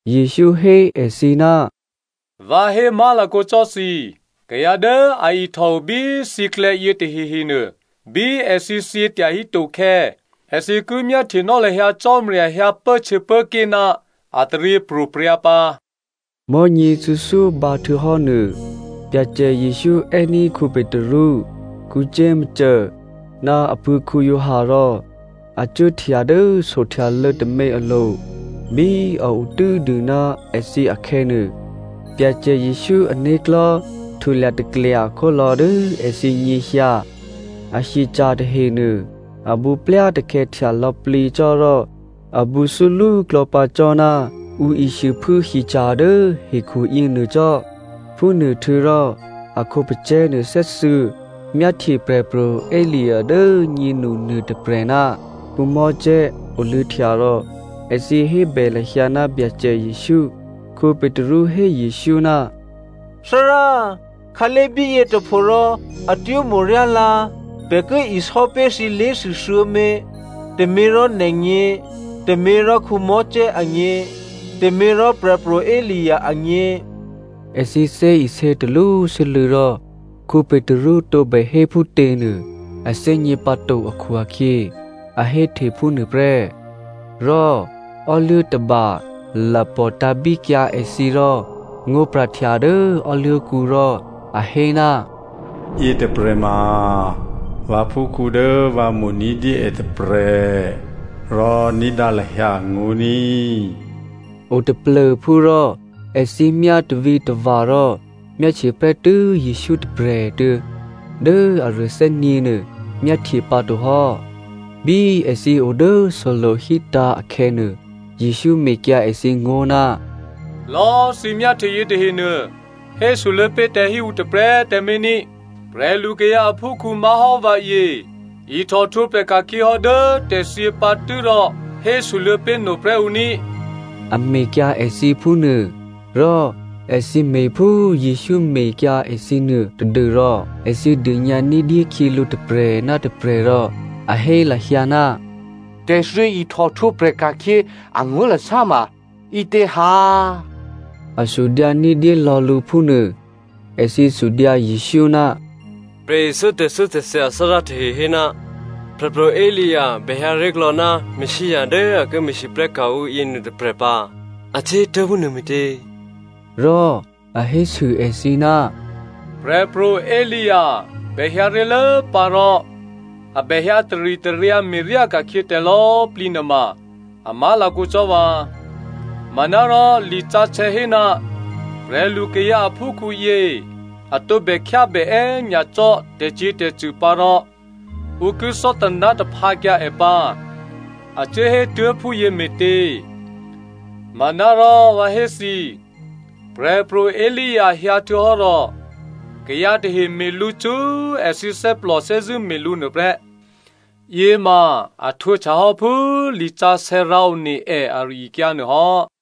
Jesǔ hé èthǐ, “Vǎ hé má̤lakǒ cò́ thǐ, kayǎ dố a ihtòo bí thǐklè̌yě tahehenuô, bí èthǐ thyě tyahí tokhè̌, èthǐ ki myáhtyenò́ lahyǎ Cò́marya hyǎ pốhtyěpốké̤ ná a taryěpro̤prya̤ pǎ.” Mò̤́nyě thuô̌thyó bǎhtuô̌hò́nuô Byacè Jesǔ è́ní̤ Petru, Jakomo ná apuố̤ Giovanni rò a cuốhtya dố sohtyalô̌ tômě alo̤. Bí a o tû́dû ná èthǐ akhè̌nuô, Byacè Jesǔ ané̤klò̤́ htulya taklya khólò̌ dố èthǐ nyěhyǎ. A hyeca̤ tahenuô abǔplyatakhè̌htya lò̌plǐ cò́ rò a bǔthúlú klò̌pǎ cò́ ná ǔ ishuôphuố hyeca̤ dố hekhuyě nuô cò́. Phúnuôhtuô̌rò a khǒpacè̤̌ nuô thè́thuô̌ myáhtye Prè̤pro̤ Elia dố꤮ nyénu nuôtôprè̤ ná Mosè oluô̌htya rò èthǐ hébè lahyǎ ná Byacè Jesǔ. Petru hé Jesǔ, “Thárá꤮, khǎlé̤ bíyě tôpho rò atwó̤ mo̤ryá lǎ. Pè̤ ki isò́pé̤ thǐ lé̤thû thuô̌mě, tôměrò nè̤gně, tôměrò Mosè agně, tôměrò Prè̤pro̤ Elia agně.” Èthǐ thè́isě talwó sû́lû̌ rò Petru tǒbè hé phútěnuô a thè́gně pǎto akhu-akhyě a héhte phúnuô prè́. Rò ò́luố̤ tôba lapò̤ tǎ̤bíkyǎ èthǐ rò ngó̤pra̤htya dố ò́luố̤kǔ rò a hé, “Yětôprè̤ ma vǎphúkhǔ dố vǎ mo̤ ní̤dyé è tôprè̤, rò ní̤dǎ lahyǎ angó̤ ní꤮.” O taplô̤phú rò èthǐ myátarítava̤ rò myáhtye prè́tû́ Jesǔ tôprè̤꤮ tuô̌, dố aruô thè́nyě̤nuô myáhtye pǎto hò́. Bí èthǐ o dố solo̤ hítǎ̤ akhè̌nuô, Jesǔ mekyǎ èthǐ ngó̤, “Lò̌꤮ thǐ myáhtye yětahenuô hésoluô̌ pé̤ tǎ hí ǔ tôprè̤꤮ tǎmé̤ ní꤮, prè̤lukayǎ aphúkhǔ má̤hò́ vǎyě ihtòhtwǒprè̤ ka̤khyě hò́ dố tè̤thyě pǎ tû́rò hésoluô̌ pé̤ noprè́ ǔ ní꤮,” a mekyǎ èthǐ phúnuô. Rò èthǐ me̤phú Jesǔ mekyǎ èthǐ nuô tadû́rò èthǐ dônyǎ ní̤dyé khyělǔ tôprè̤ ná tôprè̤ rò a hé lahyǎ, “Tè̤thyě ihtòhtwǒprè̤ ka̤khyě angó̤lasá ma ǐtě ha?” A sudyǎ ní̤dyé lò̌ lǔ phúnuô. Èthǐ sudyǎ Jesǔ, “Prè̤ithyó tè̤thyótè̤thya athárá tahe hé ná Prè̤pro̤ Elia bèhyǎ ré̤klò̌ ná Messia dố a ki me̤lwóhteka̤ ǔ yěnuô tôprè̤ pǎ, a cuốhétuố̤ phúnuô me̤tě?” Rò a hésû èthǐ, “Prè̤pro̤ Elia bè hyǎ ré̤lốpǎ rò a bè hyǎ taritaryǎ me̤ryá ka̤khyě tè̤lò̌꤮ plǐ nuôma a má̤lakǒ cò́ vǎ. Manárò lisǎsè̌ hé ná prè̤lu kayǎ aphúkhǔyě a tǒbè khyábè è́nyacò́ tè̤cyě̤tè̤cṳ̂ pǎ rò ǔ ki thò́taná̤taphǎkyǎ è pǎ a cuốhétuố̤ phúyěme̤tě? Manárò vǎ hé thǐ, Prè̤pro̤ Elia hyǎhtuô̌hò́ rò kayǎ tahe me̤ lǔ cṳ́ èthǐ thè́plò thè́zṳ̂́ me̤ lǔ nuôprè́. Yěma a htwǒhtya hò́ phú lisǎsè̌ rǎone è ari-akyǎ nuô hò́.”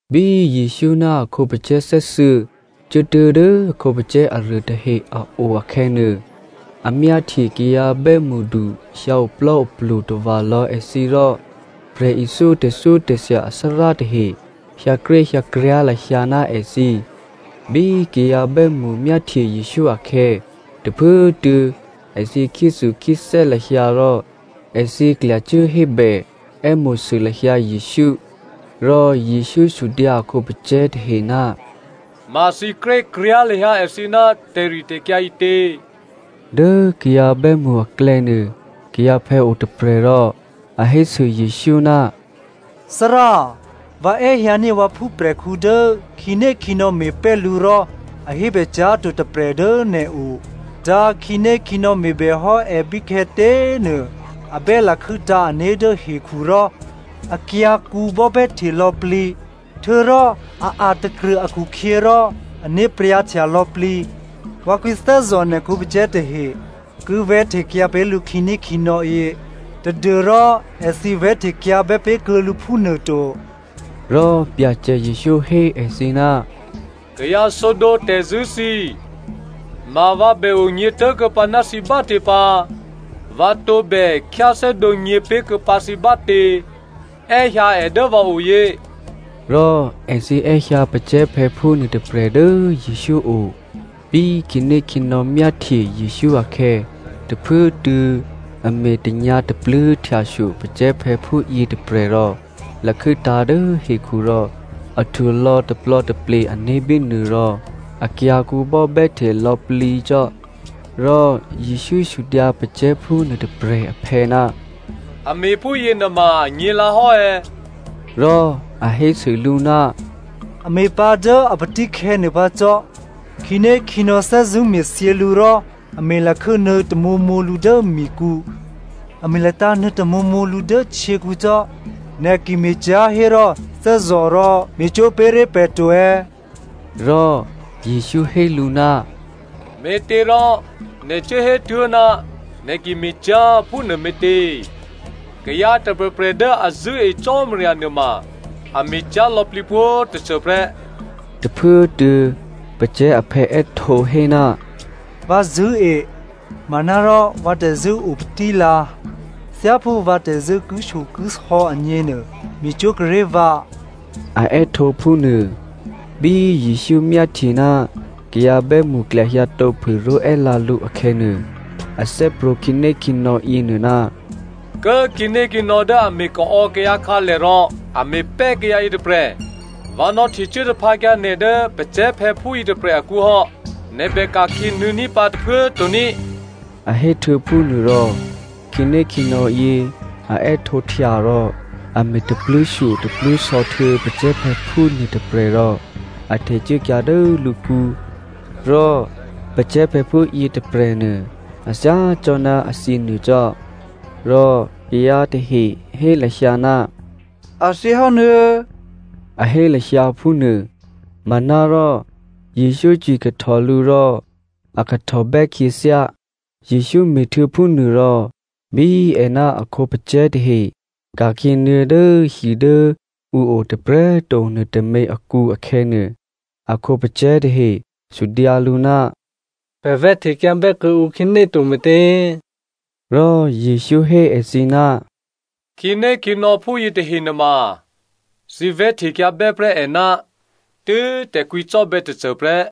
Bí Jesǔ ná a khǒpacè̤̌ thè́thuô̌ cuốtuố̤ dố a khǒpacè̤̌ aruô tahe a o akhè̌nuô, a myáhtye kayǎ bè́mṳdu hyǎoplò́oplu tava̤ lò̌ èthǐ rò prè̤ithyó tè̤thyótè̤thya athárá tahe hyǎkréhyǎkryá̤ lahyǎ ná èthǐ. Bí kayǎ bè́mṳ myáhtye Jesǔ akhè̌, tôphuốtuô̌ èthǐ khyéthukhyéthè́ lahyǎ rò èthǐ klyacuố hébè è́mo̤sû lahyǎ Jesǔ. Rò Jesǔ sudyǎ a khǒpacè̤̌ tahe, “Ma thǐ krékryá̤ lahyǎ èthǐ ná tè̤ritè̤kyǎ ǐtě?” Dố kayǎ bè́mṳ aklè̌nuô kayǎphè̌ o tôprè̤ rò a hésû Jesǔ, “Thárá꤮ vǎ è́hyǎní̤ vǎ phúprè̤khǔ dố khǐnékhǐnò̌ me̤pè́ lǔ rò a hébè cyá̤ to tôprè̤ dố nè̤o. Dǎ khǐnékhǐnò̌ me̤bè hò́ è bíkhè̌tě꤮ nuô a bè́ lakhû́tǎ̤ ané̤ dố hekhu rò akyǎ̤kǔ bò́bè́hte lò̌plǐ. Htuô̌rò a a̤takrṳ̂ akhukhyě rò ané̤ pryǎ̤htya lò̌plǐ. Vǎ kwǐthè́zò̤ nè̤ khǒpacè̤̌ tahe ki vè̤́htekyǎ pé̤ lǔ khǐnékhǐnò̌yě tadû́rò èthǐ vè̤́htekyǎbè́ pé̤kuô̌ lǔ phúnuôto.” Rò Byacè Jesǔ hé èthǐ, “Kayǎ sǒdǒ tè̤zṳ̂́ thǐ꤮ ma vǎ bè onyě̤ tố̤kuô̌pǎ ná thǐ bátě pǎ? Vǎ tǒbè khyáthè́dǒ nyě̤pé̤kuô̌pǎ thǐ bátě? È́hyǎ è dố vǎ oyě.” Rò èthǐ è́hyǎ pacè̤̌phè̌phú nuôtôprè̤ dố Jesǔ o. Bí khǐnékhǐnò̌ myáhtye Jesǔ akhè̌ tôphuốtuô̌ a me̤ tanyǎ̤tapluố̤ htyashyo pacè̤̌phè̌phú yětôprè̤ rò lakhû́tǎ̤ dố hekhu rò a htulò̌ taplò̌taple ané̤ bínuô rò akyǎ̤kǔ bò́bè́hte lò̌plǐ cò́. Rò Jesǔ sudyǎ pacè̤̌phú nuôtôprè̤ aphè̌, “A me̤ phúyě nuôma anyě̤lǎ hò́ è̌?” Rò a hésû lǔ, “A me̤pǎ dố a patíkhè̌ nuôpǎ cò́. Khǐnékhǐnò̌ thè́zṳ̂́ me̤thyě lǔ rò a me̤ lakhû́nuô̌ tamǒmǒ lǔ dố mikǔ, a me̤ latǎ̤nuô̌ tamǒmǒ lǔ dố htyěkǔ cò́. Nè̤ ki me̤cyá̤ hérò thè́zò̤ rò me̤cwó̤ pé̤ré̤ pè̤ to꤮.” Rò Jesǔ hé lǔ, “Me̤těrò nè̤ cuố hétuố̤, ‘Nè̤ ki me̤cyá̤,’ phúnuô me̤tě? Kayǎ tôprè̤prè̤ dố a zṳ̂́e Cò́marya nuôma a me̤cyá̤ lò̌plǐ pwǒ̤꤮ tôcô prè́.” Tôphuốtuô̌ pacè̤̌ aphè̌ è́htǒ hé, “Vǎ zṳ̂́e, manárò vǎ tè̤zṳ̂́ opatílǎ, thyáphú vǎ tè̤zṳ̂́ kishyokisò̌ agněnuô, me̤cwó̤ kuô̌ ré̤ vǎ!” A è́htǒ phúnuô. Bí Jesǔ myáhtye ná kayǎ bè́mṳ klyahyǎtǒphû ró̤è́lǎ lǔ akhè̌nuô, a thè́prwǒ̤ khǐnékhǐnò̌ yěnuô, “Kố꤮ khǐnékhǐnò̌ dố a me̤kaò̌ kayǎ akhǎlè rò a me̤pè́ kayǎ yětôprè̤, vǎ nò̌htecuố taphǎkyǎ nè̤ dố pacè̤̌phè̌phú yětôprè̤ akǔ hò́, nè̤ bè ka̤khyě nuô̌ní̤ pǎ tôphuố꤮ to ní,” a héhtuô̌ phúnuô rò. Khǐnékhǐnò̌yě a è́htǒhtya rò a me̤ tapluố̤shyotapluố̤sò̌ htuô̌ pacè̤̌phè̌phú nuôtôprè̤ rò a htecuốkyǎ dố lǔkǔ. Rò pacè̤̌phè̌phú yětôprè̤nuô, a thyá cò́ ná a thyěnuô cò́. Rò kayǎ tahe hé lahyǎ, “A thyěhò́ nuô̌꤮” a hé lahyǎ phúnuô. Manárò Jesǔ cwikahtò lǔ rò a kahtòbè́ khyěthyá. Jesǔ me̤htuô̌ phúnuôrò, bí è ná a khǒpacè̤̌ tahe ka̤khyě nuô̌ dố hi dố ǔ o tôprè̤꤮ to nuôtômě akǔ akhè̌nuô, a khǒpacè̤̌ tahe sudyǎ lǔ, “Pè̤ vè̤́htekyǎ bè́kuô̌ǔ khǐné to me̤tě?” Rò Jesǔ hé èthǐ, “Khǐnékhǐnò̌ phúyě tahe nuôma thǐ vè̤́htekyǎbè́ prè́ è ná tû́ tè̤kwǐcò́bè̌ tôcô prè́.”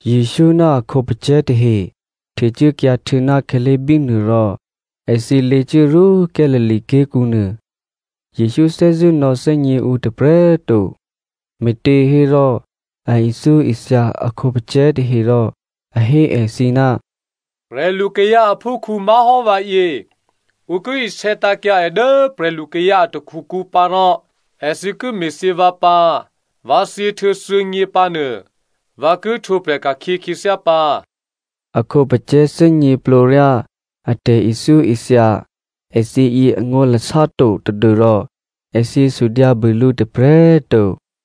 Jesǔ ná a khǒpacè̤̌ tahe htecuốkyǎ htuô̌ ná khǎlé̤ bínuô rò èthǐ lěcuốrwó Galilea ké̤kǔ nuô. Jesǔ thè́zṳ̂́ nò̌thè́gně ǔ tôprè̤꤮ to, me̤těhérò a ithyóithya a khǒpacè̤̌ tahe rò a hé èthǐ, “Prè̤lukayǎ aphúkhǔ má̤hò́ vǎyě, ǔ ki isè̌ tǎ̤kyǎ è dố prè̤lukayǎ a takhukǔ pǎ rò èthǐ ki me̤thyě vǎ pǎ. Vǎ thyěhtuô̌ thuô̌nyě pǎ nuô, vǎ ki htwǒprè̤ ka̤khyě khyěthyá pǎ.” A khǒpacè̤̌ thè́gněplǒryá a tè̤ithyóithya èthǐ yě angó̤lasá to tadû́rò èthǐ sudyǎbû lǔ tôprè̤꤮ to.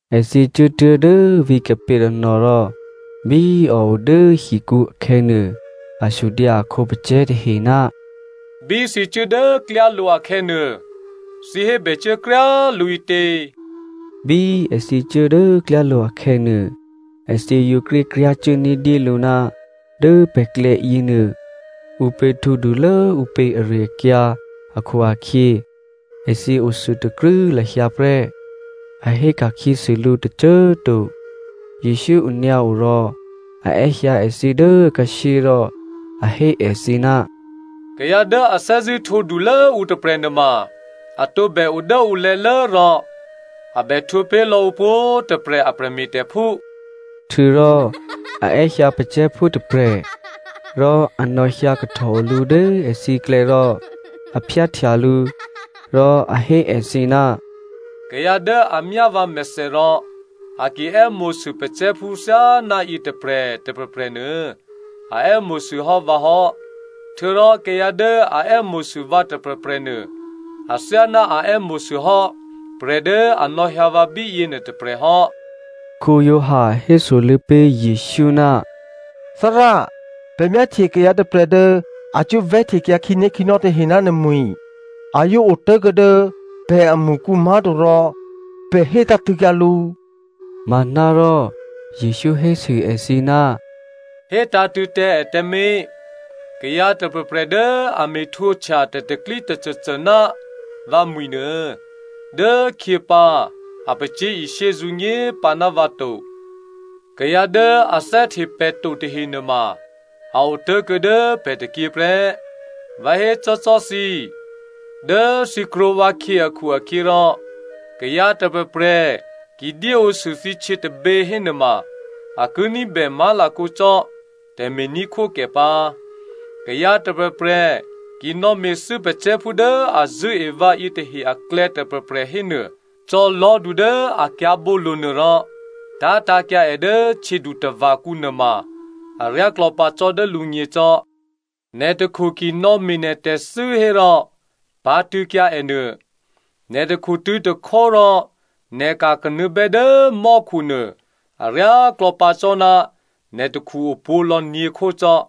Èthǐ cuốtuố̤ dố vǐ̤ Capernaum rò bí a o dố hikǔ akhè̌nuô, a sudyǎ a khǒpacè̤̌ tahe, “Bí thǐ cuố dố klyálo̤ akhè̌nuô, thǐ hébè cuố kryá꤮ lǔ ǐtě?” Bí èthǐ cuố dố klyálo̤ akhè̌nuô, èthǐ yǒ krékryá̤cuố ní̤dyélǔ ná dố pè̤klè̌ yěnuô, ǔpě htwǒdulố ǔ pě ari-akyǎ akhu-akhyě, èthǐ othuôtakrû́ lahyǎ prè́, a hé ka̤khyěsû lǔ tôcô꤮ to. Jesǔ onyǎo rò a è́hyǎ èthǐ dố akhǎshyé rò a hé èthǐ, “Kayǎ dố a thè́zṳ̂́ htwǒdulố ǔ tôprè̤ nuôma a tǒbè o dố ǔ lè̤̌lố rò a bè htwǒpé̤ lò̌ ǔ pwǒ̤꤮ tôprè̤ a prè̤me̤tè̤phú.” Htuô̌rò a è́hyǎ pacè̤̌phú tôprè̤ rò a nò̌hyǎ kahtòo lǔ dố èthǐklè̌ rò a phyáhtya lǔ rò a hé èthǐ, “Kayǎ dố a myá vǎmèthè rò a ki è́mo̤sû pacè̤̌phú thyáná yětôprè̤ tôprè̤prè̤nuô a è́mo̤sû hò́ vǎ hò́. Htuô̌rò kayǎ dố a è́mo̤sû vǎ tôprè̤prè̤nuô athyáná a è́mo̤sû hò́ prè̤ dố a nò̌hyǎ vǎ bíyě nuôtôprè̤ hò́.” Giovanni hésoluô̌ pé̤ Jesǔ, “Thárá꤮ pè̤ myáhtye kayǎ tôprè̤ dố a cuố vè̤́htekyǎ khǐnékhǐnò̌ tahe ná nè̤mwi̤. A yǒ otố̤kuô̌ dố pè̤amṳkǔ má̤to rò pè̤ hé tǎ̤tṳ̂̌kyǎ lǔ.” Manárò Jesǔ hésû èthǐ, “Hétǎ̤tṳ̂̌ tǎ è tǎmé̤, kayǎ tôprè̤prè̤ dố a me̤ htwǒhtya tè̤pro̤tè̤prya̤ tôcôcô ná vǎ mwi̤nuô dốkhyěpǎ a pacyé̤ishyé zǔnyé pǎ ná vǎ to. Kayǎ dố a thè́hte pè̤ to tahe nuôma a otố̤kuô̌ dố pè̤ tôkyě prè́. Vǎ hécò́cò́ thǐ, dố thǐ krwǒ vǎkhyě akhu-akhyěrò, kayǎ tôprè̤prè̤ ki dyéǒsû thǐ htyě tôbě hénuôma a ki ní̤bè má̤lakǒ cò́ tè̤me̤ní̤khwókè pǎ. “Kayǎ tôprè̤prè̤ ki nò̌me̤thû́ kayǎ patílố dố a zṳ̂́e vǎ yětahe aklè̌ tôprè̤prè̤ hénuô, cò̌ lò̤́du dố a kyǎ̤bǒlo̤nuô rò tá̤tǎ̤kyǎ è dố htyědutava̤kǔ nuôma aryáklò̌ pǎ cò́ dố lǔgně cò́. Nè̤ takhu ki nò̌me̤ nè̤ tè̤thû́ hérò pǎ̤tṳ̂̌kyǎ ènuô. Nè̤ takhutṳ̂̌ tôkhó rò nè̤ ka̤kanuô̌bè́ dố mò́khunuô aryáklò̌ pǎ cò́ ná nè̤ takhu opwǒ̤lò̌ nyě̤khó cò́.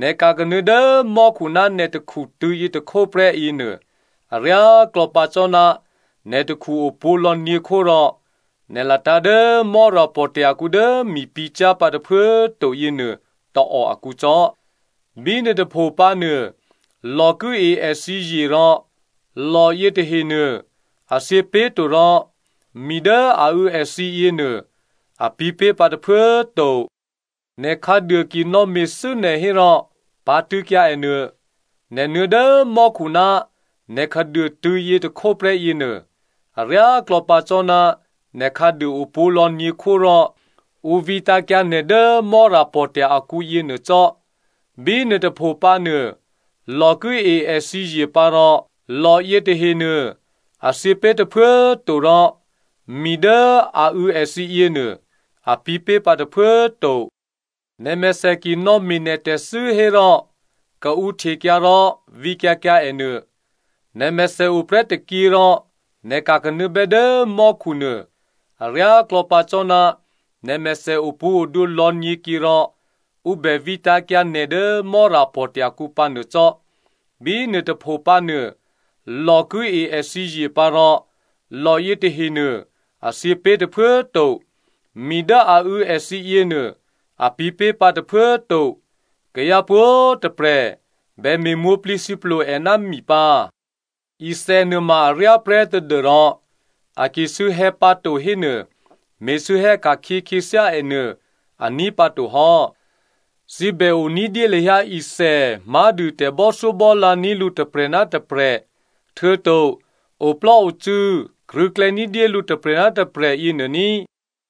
Nè̤ ka̤kanuô̌ dố mò́khu ná nè̤ takhu tṳ̂̌yětôkhó prè́ yěnuô, aryáklò̌ pǎ cò́ ná nè̤ takhu opwǒ̤lò̌ nyě̤khó rò nè̤ latǎ̤ dố Mò́rapò̤tya̤ kǔ dố mi pǐ̤ cyá̤ pǎ tôphuố꤮ to yěnuô tôò akǔ cò́. (Bínuô tôpho pǎnuô lò ki e èthǐ zye rò lò yětahenuô a thyěpé̤to rò mi dố a û̌ èthǐ yěnuô, a pǐ̤pé̤ pǎ tôphuố꤮ to.) Nè̤ khǎduô ki nò̌me̤thû́ nè̤ hérò pǎ̤tṳ̂̌kyǎ è nuô. Nè̤ nuô̌ dố mò́khu ná nè̤ khǎduô tṳ̂̌yětôkhó prè́ yěnuô, aryáklò̌ pǎ cò́ ná nè̤ khǎduô opwǒ̤lò̌ nyě̤khó rò ǔ vǐtǎ̤kyǎ nè̤ dố mò́rapò̤tya̤ akǔ yěnuô cò́. (Bínuô tôpho pǎ nuô, lò ki e èthǐ zye pǎ rò lò yětahe nuô a thyěpé̤ tôphuố꤮ to rò mi dố a û̌ èthǐ yěnuô, a pǐ̤pé̤ pǎ tôphuố꤮ to.) Nè̤mèthè ki nò̌me̤ nè̤ tè̤thû́ hérò kaǔhtekyǎ rò vǐkyǎ kyǎ ènuô. Nè̤mèthè oprè́ tôkyě rò nè̤ ka̤kanuô̌bè́ dố mò́khu nuô aryáklò̌ pǎ cò́ ná nè̤mèthè opwǒ̤odwǒ lò̌nyě̤kyě rò ǔ bè vǐtǎ̤kyǎ nè̤ dố Mò́rapò̤tya̤ kǔ pǎnuô cò́. Bínuô tôpho pǎ nuô, ‘Lò ki e èthǐ zye pǎ rò lò yětahenuô, a thyěpé̤ tôphuố꤮ to. Mi dố a û̌ èthǐ yěnuô, a pǐ̤pé̤ pǎ tôphuố꤮ to.’ “Kayǎ pwǒ̤꤮ tôprè̤ bè me̤mwǒ̤plǐthǐplo è ná mi pǎ. “Ithè nuôma aryá prè́ tadû́rò a ki sû̌hè̌ pǎto hénuô me̤sû̌hè̌ ka̤khyě khyěthyá è nuô aní̤ pǎto hò́. Thǐ bè o ní̤dyé lahyǎ ithè má̤dû tè̤bò́thyóbò́lǎ ní̤ lǔ tôprè̤ ná tôprè̤, htuô̌to oplò́ocû̌ krṳ̂̌klè̌ ní̤dyé lǔ tôprè̤ ná tôprè̤ yěnuô ní꤮.”